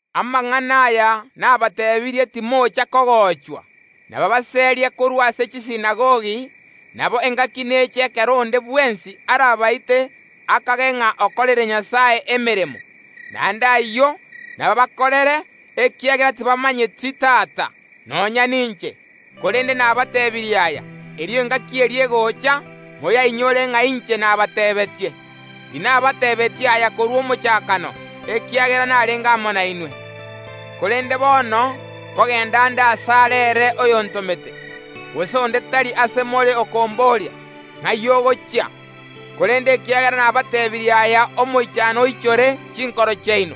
“Amang’ana aya nabateebirie timocha kogochwa. Nabaabaserie korwa ase chisinagogi; nabo engaki neche ekero onde bwensi arabaite akage ng’a okoreire Nyasae emeremo. Naende ayio nabaabakorere, ekiagera tibamomanyeti Tata, nonya ninche. Korende nabateebirie aya, erio engaki eria egocha, moyainyore ng’a inche nabateebeetie. “Tinabateebeetie aya korwa omochakano, ekiagera narenge amo nainwe. Korende bono nkogenda nde asare ere oyontomete; gose onde tari ase more okomboria: Ing’ai ogochia? Korende ekiagera nabateebirie aya, omoichano oichoire chinkoro chiaino.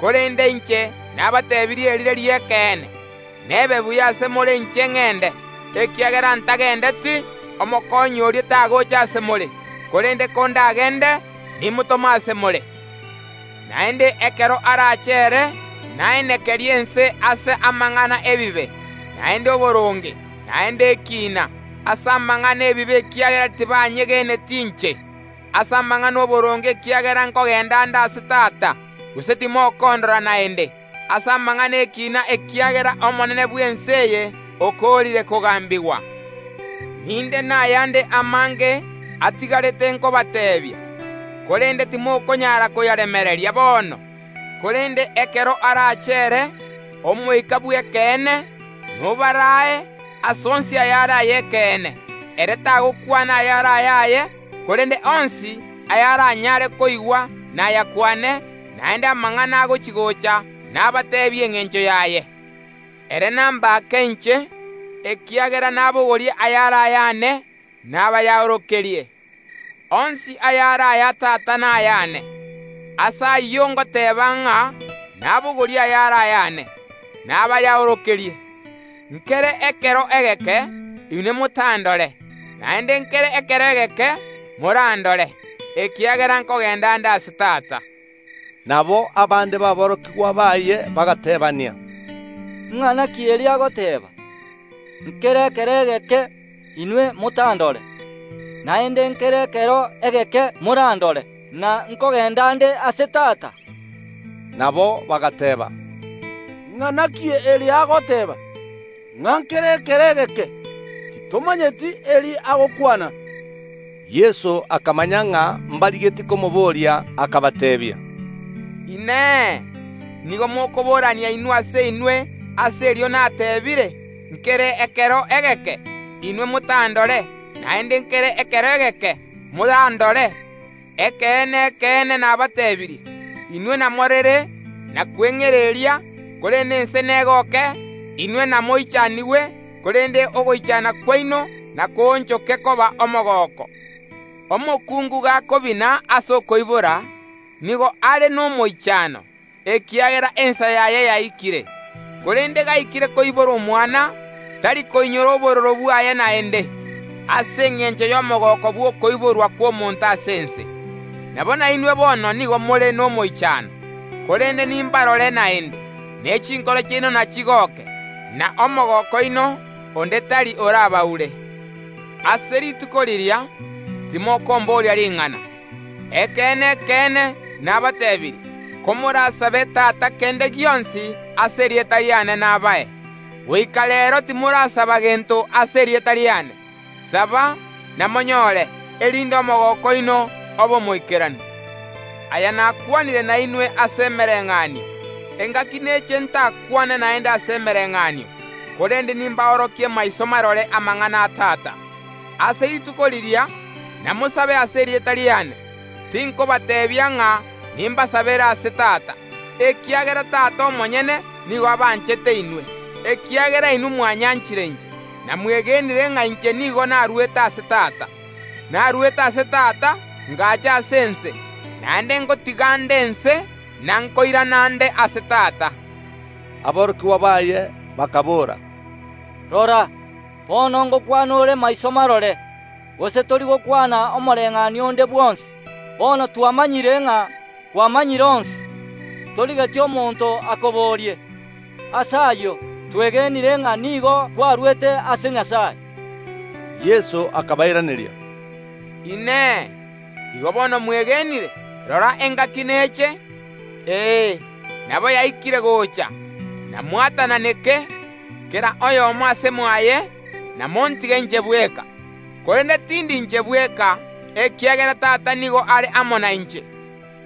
Korende inche nabateebirie erire ri’ekeene: Nebe buya ase more inche ngende, ekiagera ntagendeti, Omokonyi oria tagocha ase more; korende kondagende, nimotome ase more. Naende ekero arache ere, naenekerie ense ase amang’ana ’ebibe, naende oboronge, naende ekiina; ase amang’ana ’ebibe, ekiagera tibanyegeneti inche; ase amang’ana ’oboronge, ekiagera nkogenda nde ase Tata, gose timokondora naende; ase amang’ana ’ekina, ekiagera omonene bw’ense eye okoorire kogambigwa. “Ninde nayande amange atigarete nkobateebia, korende timokonyara koyaremereria bono. Korende ekero arache ere, Omoika bw’Ekeene, nobaraae ase onsi ayare ay’ekeene, ere tagokwana ayare ayaye, korende onsi ayaranyare koigwa nayakwane, naende amang’ana agochi‐gocha nabateebie engencho yaye. Ere nambake inche, ekiagera nabogorie ayare ayane, nabayaorokerie. Onsi ayare aya Tata nayane; ase ayio ngateba ng’a nabogorie ayare ayane, nabayaorokerie. “Nkere ekero egeke, inwe motandore; naende nkere ekero egeke morandore, ekiagera nkogenda nde ase Tata.” Nabo abande baborokigwa baye bagateebania, “Ing’ana ki eri agoteeba: Nkere ekero egeke, inwe motandore; naende nkere ekero egeke morandore; na: Nkogenda nde ase Tata?” Nabo bagateeba, “Ing’ana ki eri agoteeba, ng’a nkere ekero egeke? Titomanyeti eri agokwana.” Yeso akamanya ng’a mbarigetie komoboria, akabateebia, “Inee! Nigo mokoborania inwe ase inwe ase erio natebiire: Nkere ekero egeke, inwe motandore, naende nkere ekero egeke morandore? Ekeene, ekeene, nabateebirie: Inwe namorere na kweng’ereria, korende ense negoke; inwe namoichanigwe, korende ogoichana kwaino nakoonchoke koba omogooko. Omokungu gakobina ase okoibora, nigo are nomoichano, ekiagera ensa yaye yaikire; korende gaikire koibora omwana, tari koinyora obororo bwaye naende, ase engencho y’omogooko bw’okoiborwa kw’omonto ase ense. Nabo nainwe bono nigo more nomoichano; korende nimbarore naende, ne chinkoro chiaino nachigoke, na omogooko oino onde tari orabaure. Ase rituko riria timokomboria ring’ana. Ekeene, ekeene, nabateebirie: Komorasabe Tata kende gionsi ase erieta riane nabae. Goika reero timorasaba gento ase erieta riane; saba, namonyore, erinde omogooko oino obe omoikeranu. “Aya nakwanire nainwe ase emereng’anio; engaki neche ntakwane naende ase emereng’anio, korende nimborokie maiso marore amang’ana a Tata. Ase rituko riria namosabe ase erieta riane; tinkobateebia ng’a nimbasabere ase Tata, ekiagera Tata omonyene nigo abanchete inwe, ekiagera inwe mwanyanchire inche, na mwegenire ng’a inche nigo narwete ase Tata. Narwete ase Tata, ngacha ase ense; naende ngotiga nde ense na nkoirana nde ase Tata.” Aborokigwa baye bakaboora, “Rora, bono ngokwana ore maiso marore, gose tori gokwana omobayeeno onde bwonsi. Bono twamanyire ng’a kwamanyire onsi, torigeti omonto akoborie. Ase ayio twegenire ng’a nigo kwarwete ase Nyasae.” Yeso akabairaneria, “Inee! Igo bono mwegenire? Rora engaki neche, ee nabo yaikire gocha, namwatananeke, kera oyomo ase mwaye, namontige inche bweka, korende tindi inche bweka, ekiagera Tata nigo are amo nainche.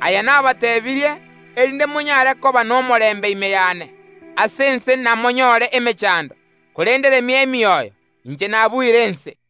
Aya nabateebirie, erinde monyare koba nomorembe ime yane. Ase ense namonyore emechando, korende remia emioyo; inche nabuire ense.”